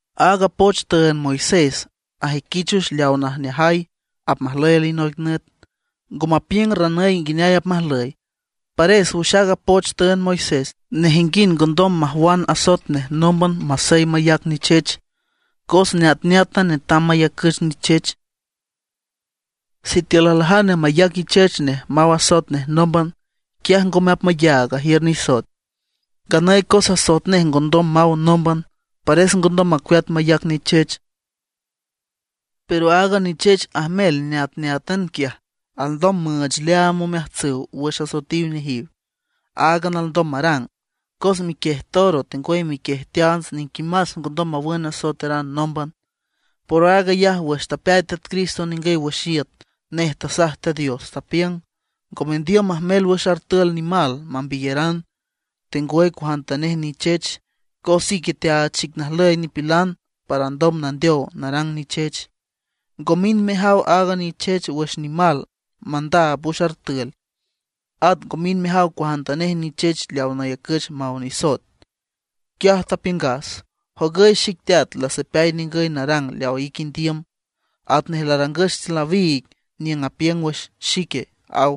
Aaga poch tüünd Moisés ajüiquich wüx leawa najneajay apmajlüy alinoic nüt, ngo mapiüng ranüy nguineay apmajlüy. Pares wüx aaga poch tüünd Moisés, nejinguind ngondom majwan asoet nej nómban masey mayac nichech, cos neatneátan netam mayacüch nichech. Sitiül aljane mayac ichech nej maw asoet nej nómban, quiaj ngome apmayaag ajiür nisoet. Nganüy cos asoet nej ngondom maw nómban, pares ngondom macueat mayac nichech. Pero aaga nichech ajmel neatneátan quiaj, alndom müüch leaam omeajtsüw wüx asoetiw nejiw, áagan alndom marang. Cos miquiej toro, tengwüy miquiej teants niquimás ngondom mawün asoeteran nómban. Por aag ayaj wüx tapeay Teat Cristo ningüy wüx iüt, nej tasaj Teat Dios, tapiüng: Ngo mendiüm majmel wüx artül nimal nambiyeran, tengwüy cuajantanej nichech, cos ique teaach xic najlüy nipilan para ndom nandeow narang nichech. Ngo mind mejaw aaga nichech wüx nimal mandaab wüx artül; at ngo mind mejaw cuajantanej nichech leaw nayacüch maw nisoet. Quiaj tapiüngas: “Jogüy xic Teat, lasapeay ningüy narang leawa ique indiüm, atnej larangüch tiül nawiig niüng apiüng wüx xique”, aw.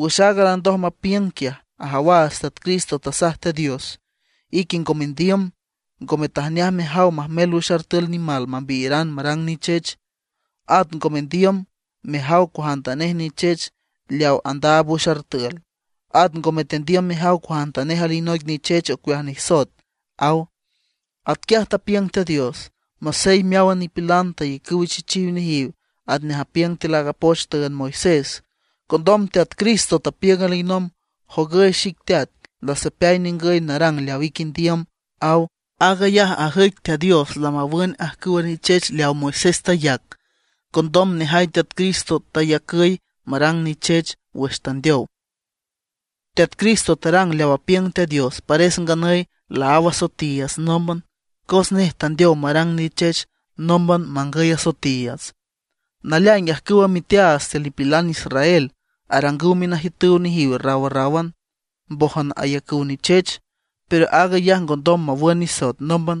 Wüx aaga landoj mapiüng quiaj, ajawaats Teat Cristo tasaj Teat Dios: “Ique ngo mendiüm, ngome tajneaj mejaw majmel wüx artül nimal nambiyeran marang nichech. At ngome tendiüm mejaw cuajantanej nichech leaw andaab wüx artül; at ngome tendiüm mejaw cuajantanej alinoic nichech ocueaj nisoet”, aw. Atquiaj tapiüng Teat Dios, masey meáwan nipilan tayacüw ichechiw nejiw atnej apiüng tiül aaga poch tüünd Moisés. Condom Teat Cristo tapiüng alinomb: “Jogüy xic Teat, lasapeay ningüy narang leaw ique indiüm”, aw. Aag ayaj ajüic Teat Dios lamawün ajcüwa nichech leaw Moisés tayac, condom nejay Teat Cristo teyacüy marang nichech wüx tandeow. Teat Cristo tarang leaw apiüng Teat Dios, pares nganüy laáw asoetiiüts nómban, cos nej tandeow marang nichech nómban mangüy asoetiiüts. Naleaing ajcüwa miteaats tiül nipilan israel arangüw minajiütüw nejiw rawrráwan, mbójan ayacüw nichech; pero aag ayaj ngondom mawün nisoet nómban.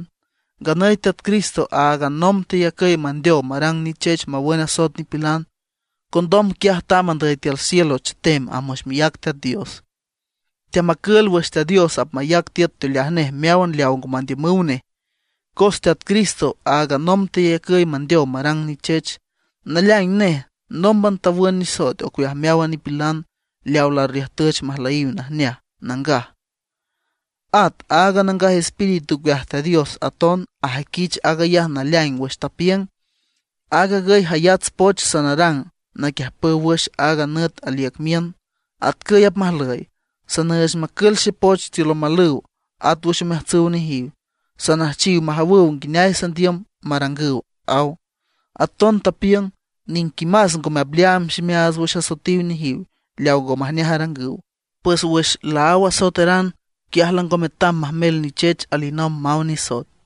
Nganüy Teat Cristo áagan nomb teyacüy mandeow marang nichech mawün asoet nipilan. Condom quiaj tamb andüy tiül cielo chetem amb wüx miác Teat Dios. Teamacül wüx Teat Dios apmayac tiüt teoleaj nej meáwan leaw ngo mandiümüw nej. Cos Teat Cristo áagan nomb teyacüy mandeow marang nichech. Naleaing nej nómban tawün nisoet ocueaj meáwan nipilan leawa larriüjtüch majlüyiw najneaj, nangaj. At aaga Nangaj Espíritu ocueaj Teat Dios aton ajüiquich aag ayaj naleaing wüx tapiüng: Aag agüy jayats poch sanarang naquiüjpüw wüx aaga nüt aliüc miün, atcüy apmajlüy: Sanüüch macül xepoch tiül omalüw, at wüx omeajtsüw nejiw. Sanüjchiw majawüw nguineay sandiüm marangüw, aw. Aton apiüng: Niquimás ngome apleaam ximeaats wüx asoetiw nejiw, leaw ngo majneaj arangüw. Pues wüx laáw asoeteran, quiaj lango metam majmel nichech alinomb maw nisoet.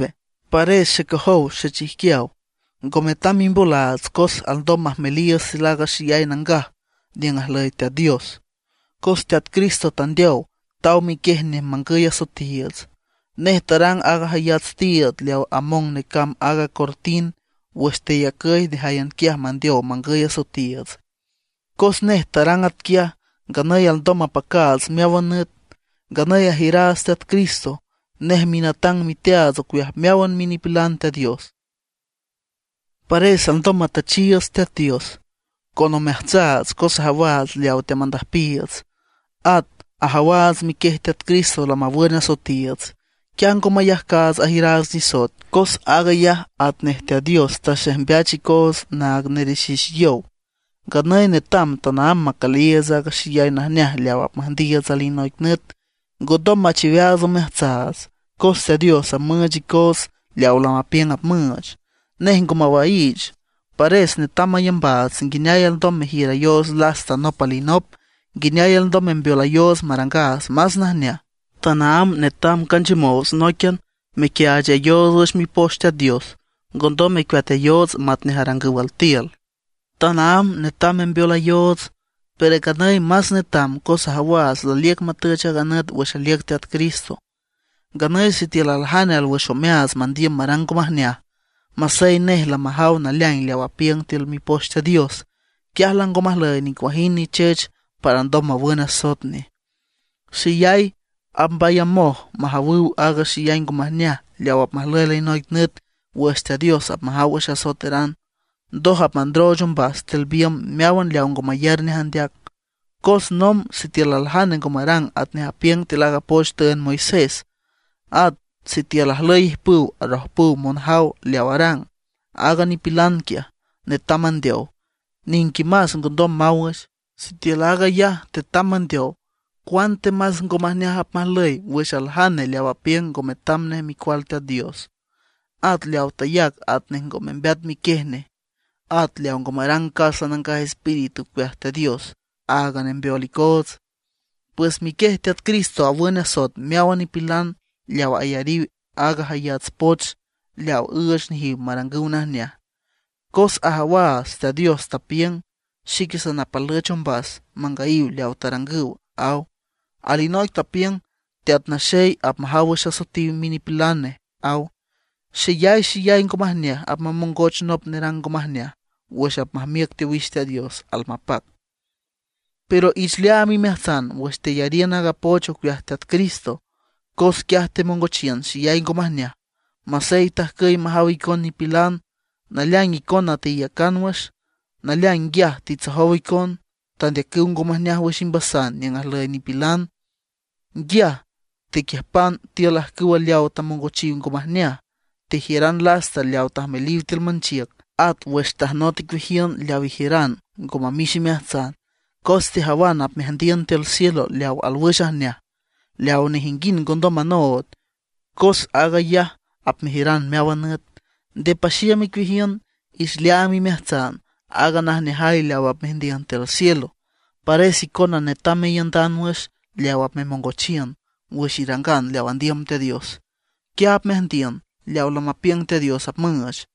Pares xecojow xechijquiaw, ngo metam mimbolaats cos alndom majmeliiüts tiül aaga Xeyay Nangaj niüng ajlüy Teat Dios, cos Teat Cristo tandeow, taw miquiej nej mangüy asoetiiüts. Nej tarang aaga jayats tiiüd leaw among necamb aaga cortin wüx teyacüy nejáyan quiaj mandeow mangüy asoetiiüts. Cos nej tarang atquiaj, nganüy alndom mapacaats meáwan nüt. Nganüy ajiüraats Teat Cristo, nej minatang miteaats ocueaj meáwan minipilan Teat Dios. Pares alndom matüchiiüts Teat Dios con omeajtsaats cos ajawaats leawa teamandüjpiiüts. At ajawaats miquiej Teat Cristo lamawün asoetiiüts; quiaj ngo mayajcaats ajiüraats nisoet, cos aag ayaj atnej Teat Dios taxejmbeach icoots naag nerexix yow. Nganüy netam tanaámb macüliiüts aaga xeyay najneaj leaw apmüjndiiüts alinoic nüt; ngondom machiweaats omeajtsaats, cos Teat Dios apmüüch icoots leawa lamapiüng apmüüch, nej ngo mawaiich. Pares netam mayambaats nguineay alndom mejiürayoots lasta nop alinop, nguineay alndom membeolayoots marangaats más najneaj. Tanaámb netam canchiümoots nóiquian mequiaachayoots wüx Mipoch Teat Dios; ngondom mecueatayoots matnej arangüw altiül. Tanaámb netam membeolayoots, pero nganüy más netam cos ajawaats laliüc matüch aaga nüt wüx aliüc Teat Cristo. Nganüy sitiül aljane alwüx omeaats mandiüm marang ngo majneaj, masey nej lamajaw naleaing leaw apiüng tiül Mipoch Teat Dios, quiaj lango majlüy nicuajind nichech para ndom mawün asoet nej. Xeyay apmbayamoj majawüw aaga xeyay ngo majneaj leaw apmajlüy alinoic nüt wüx Teat Dios apmajaw wüx asoeteran, ndoj apmandrooch ombas tiül biümb meáwan leaw ngo mayar nej andeac. Cos nomb sitiül aljane ngo marang atnej apiüng tiül aaga poch tüünd Moisés, at sitiül ajlüy ijpüw arojpüw monjaw leaw arang, aaga nipilan quiaj netam mandeow, niquimás ngondom maw wüx. ¡Sitiül aag ayaj tetam mandeow, cuantemas ngo majneaj apmajlüy wüx aljane leaw apiüng ngo metam nej Micual Teat Dios; at leaw tayac atnej ngo membeat miquiej nej; at leaw ngo marang casa Nangaj Espíritu ocueaj Teat Dios, aaga nembeol icoots! Pues miquiej Teat Cristo awün asoet meáwan nipilan leaw ayariw aaga jayats poch leaw üüch nejiw marangüw najneaj. Cos ajawaats Teat Dios tapiüng: “Xique sanapalüch ombas mangüyiw leawa tarangüw”, aw. Alinoic tapiüng: “Teat Naxey apmajaw wüx asoetiw minipilan nej”, aw. ¡Xeyay xeyay ngo majneaj apmamongoch nop nerang ngo majneaj wüx apmajmiüc teowix Teat Dios almapac! Pero ich leaam imeajtsan wüx teyariün aaga poch ocueaj Teat Cristo, quiaj temongochiün xeyay ngo majneaj. Masey tajcüy majaw icon nipilan, naleaing icona teiücan wüx. Naleaing nguiaj titsojow icon, tandeacüw ngo majneaj wüx imbasan niüng ajlüy nipilan. Nguiaj tequiüjpan tiül ajcüw leawa tamongochiw ngo majneaj. Tejiüran lasta leawa tajmeliw tiül manchiüc. At wüx tajnot icueajiün leaw ijiüran ngo mamix imeajtsan, cos tejawan apmeajndiün tiül cielo leaw alwüx ajneaj, leaw nejinguind ngondom manood, cos aag ayaj apmejiüran meáwan nüt. Nde paxiüm icueajiün; ich leaam imeajtsan aaga najneajay leaw apmeajndiün tiül cielo. Pares icona netam meiündan wüx leaw apmemongochiün wüx irangan leaw andiüm Teat Dios; quiaj apmeajndiün leaw lamapiüng Teat Dios apmüüch.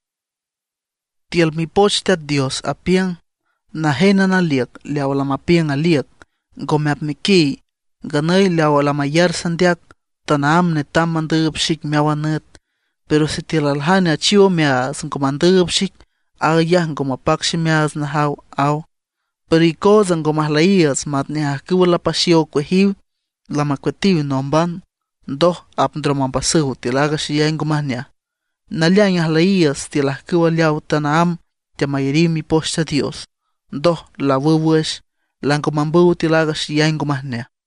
Tiül Mipoch Teat Dios apiüng: Najénan aliüc leawa lamapiüng aliüc, ngome apmequiy. Nganüy leaw lamayar sandeac, tanaámb netam mandüüb xic meáwan nüt. Pero sitiül aljane achiw omeaats, ngo mandüüb xic, aag ayaj ngo mapac ximeaats najaw, aw. Pero icootsa ngo majlüyiiüts matnej ajcüw lapaxiow ocueajiw, lamacueatiw nómban, ndoj apndrom ombasüw tiül aaga xeyay ngo majneaj. Naleaing ajlüyiiüts tiül ajcüw leaw tanaámb teamayariw Mipoch Teat Dios, ndoj laawüw wüx, lango mambüw tiül aaga xeyay ngo majneaj.